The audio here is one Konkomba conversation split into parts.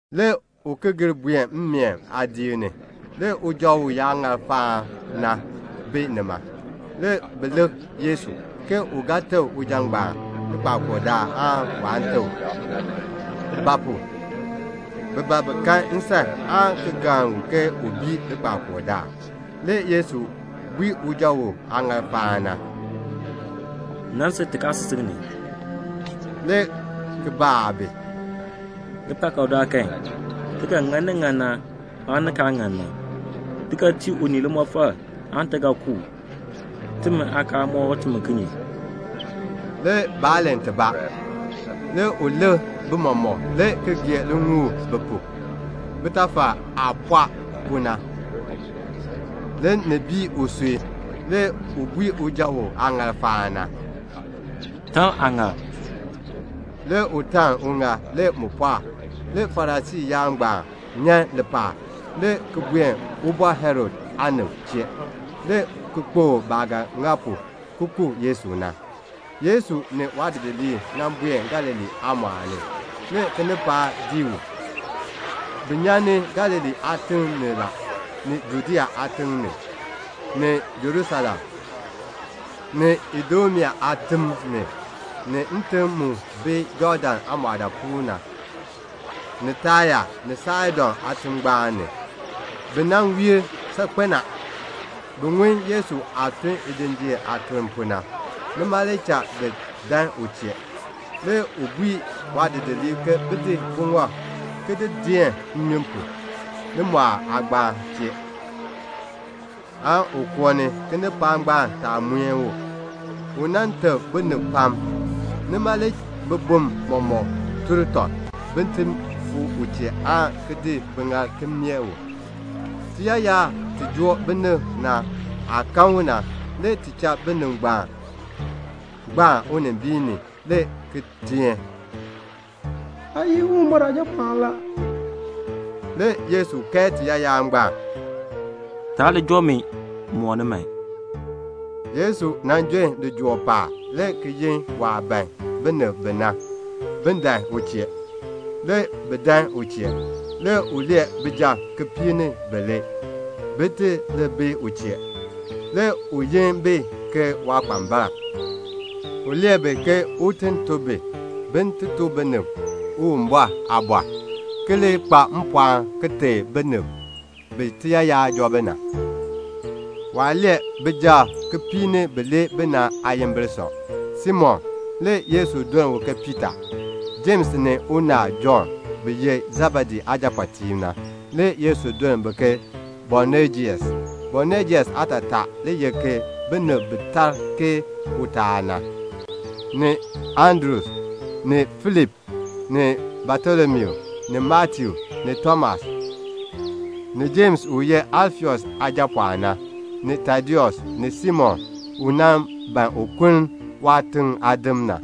Le u ki gir buen mmeen aadiik ni. Le uja uyaaŋaal faan na bi nima. Le bi lik Yesu, ke u ga teb uja ngbaan likpakool daal aan waan teb u. Ba pu? bi ban bi kan nsan aan ki galn u ke u bii likpakool daal. Le Yesu bui uja uyaaŋaal faan na, "Nan sil tikaasisik ni," le ki baa bi, "Likpakool daal kan, ti ga ŋa ni ŋan na aan ni kaa ŋan na? Ti ga tii unii limɔfal aan ti ga ku u? Timi aakaal mɔk timi kinye?" Le baa len tibaa. Le u lik bi mɔmɔk, le ki gee liŋuul bi pu. Bitafal aah pɔɔ pu na, ni bii usui la. Le u bui uja uyaaŋaal faan na, "Taln aaŋaal." Le u taln uŋaal. Le mu pɔɔk. Le Farisii yaab ngbaan nyan lipaal, le ki buen Ubɔr Herod aanib chee, le ki kpokl baah ga ŋa pu ki ku Yesu na. Le Yesu ni waadidiliib buen Galilee aamɔɔl ni. Le kinipaak dii u. Bi nyan Galilee aatim ni la, ni Judea aatim ni, ni Jerusalem, ni Idumea aatim ni, ni ntim mu bi Jɔɔdan aamɔɔdaapuul na, ni Taya ni Saidon aatingbaan ni. Bi nan wiir saakpen a. Bi ŋun Yesu aah tun lijinjiir aatun pu na. Nima le cha bi dan u chee. Le u bui waadidiliib ke bin di buŋɔb, ki di deen nnyun pu, limɔɔl aagbaan chee, aan un koo ni, kinipaak ngbaan taa muen u. U nan teb binib pam. Nima le bibum mɔmɔk mueni tɔb, bin ti fuu u chee aan ki di biŋaal ki meeh u. Tiyaayar ti joo binib na aah kan u na, le ti cha bi gbaan unimbiin ni, le ki teen, "Aa ye Uwumbɔr Aajapɔɔn la." Le Yesu kae tiyaayar ngbaan, "Taa li joo mi mooni man." Le Yesu jon lijool paab, le ki yin waah ban binib bi na, bin dan u chee. Le bi dan u chee. Le u lee bijab kipiik ni bilee, bin ti li bi u chee. Le u yi bi ke waakpambalb. U lee bi ke un ti tun bi, bin ti tuk binib Uwumbɔr aaliin, ki li kpa mpɔɔn ki teb binib bi tiyaayar joo bi na. Waah lee bijab kipiik ni bilee na aayimbil sɔ: Simon, (le Yesu duln u ke Piita); Jems ni unaal Jɔnn bi ye Sebedee aajapɔɔtiib na, (le Yesu duln bi ke Boanejes. Boanejes aatataa le ye "Binib bi tar ke utaal na"); ni Andru, ni Filip, ni Batolomiu, ni Matiu ni Tomas, ni Jems u ye Alfeus aajapɔɔn na; ni Tadeus; ni Simon u nan ban un kuln waatiŋ aadim na;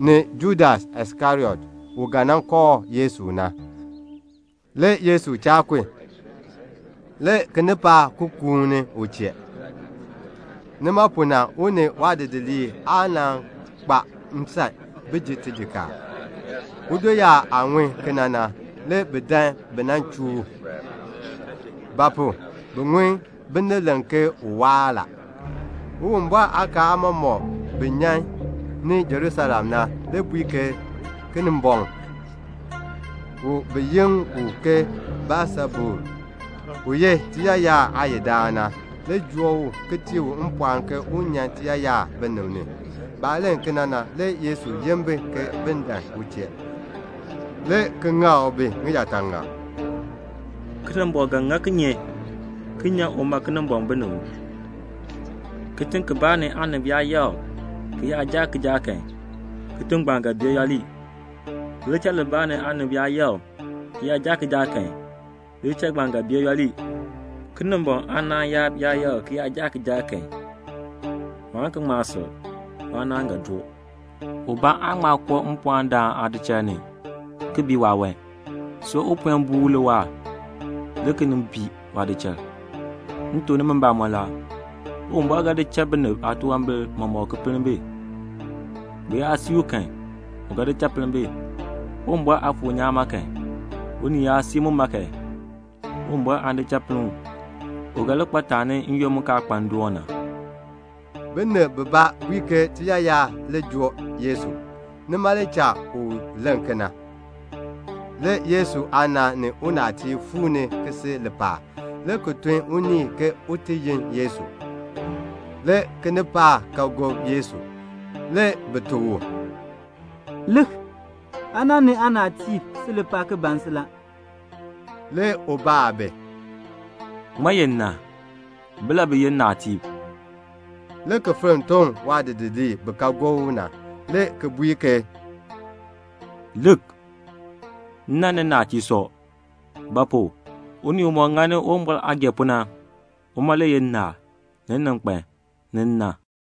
ni Judas Iskariot, u ga nan kooh Yesu na. Le Yesu cha kun. Le kinipaak ki kuuni u chee. Nima pu na le u ni waadidiliib aa kpa nsan bin ji tijikaar. Udoyaab aah ŋun kena na, le bi dan bi nan chuu u; ba pu? bi ŋun binib len ke u waar la. Le Uwumbɔr aakaal aamɔmɔkb bi nyan ni Jerusalem na le bui ke Kinimbɔŋ, bi yi u ke Beelsebul, u ye tiyaayar aayidaan na, le joo u ki tii u mpɔɔn ke un nyan tiyaayar binib ni. Baah len kena na, le Yesu yin bi ke bin dan u chee, le ki ŋak bi ŋiyaataŋak, "Kinimbɔŋ ga ŋa kinye ki nyan uma Kinimbɔŋ binib ni? Kitiŋ kibaa ni aanib yaa yakr tɔb, ki yaa jaa kijaak kan, kitiŋ ngbaan ga bee yooli. Lidichal libaa ni aanib yaa yakr tɔb ki jaa kijaak kan, lidichal ngbaan ga bee yooli. Kinimbɔŋ aanaan yaab yaa yakr tɔb ki jaa kijaak kan, waan ki ŋma sil. Waanaan ga doo." "Ubaa aan ŋma koo mpɔɔndaan aadichal ni, ki bii waawan, see u puen buu u le waahr, le ki nin bii waadichal. "M tuk nimi mbamɔn la, Uwumbɔr ga di cha binib aatunwambir mɔmɔk ki pinn bi. Bi yaa sii u kan, u ga di cha pinn bi. Uwumbɔr Aafuur nyaan ma kan, unii yaa sii muma kan, Uwumbɔr aan di cha pinn u. U ga li kpa taani n-yoonn mu kaa kpa ndoon na la." (Binib bibaa bui ke tiyaayar le joo Yesu. Nima le cha u len kena.) Le Yesu aana ni unaatiib fuu ni ki si lipaal, le ki tun unii ke un ti yi Yesu. Le kinipaak ka gob Yesu. Le bi tuk u, "Lik, aana ni aanaatiib si lipaal ki ban si la." Le u baa bi, "Ŋmaa ye nna? Bilabi ye nnaatiib?" le ki fenn toŋ waadidiliib bi ka gob u na, le ki bui ke, "Lik, nna ni nnaatiib sɔ. Ba pu? unii umɔk ŋani Uwumbɔr aah gee pu na, uma le ye nnaal, ni nninkpan, ni nna."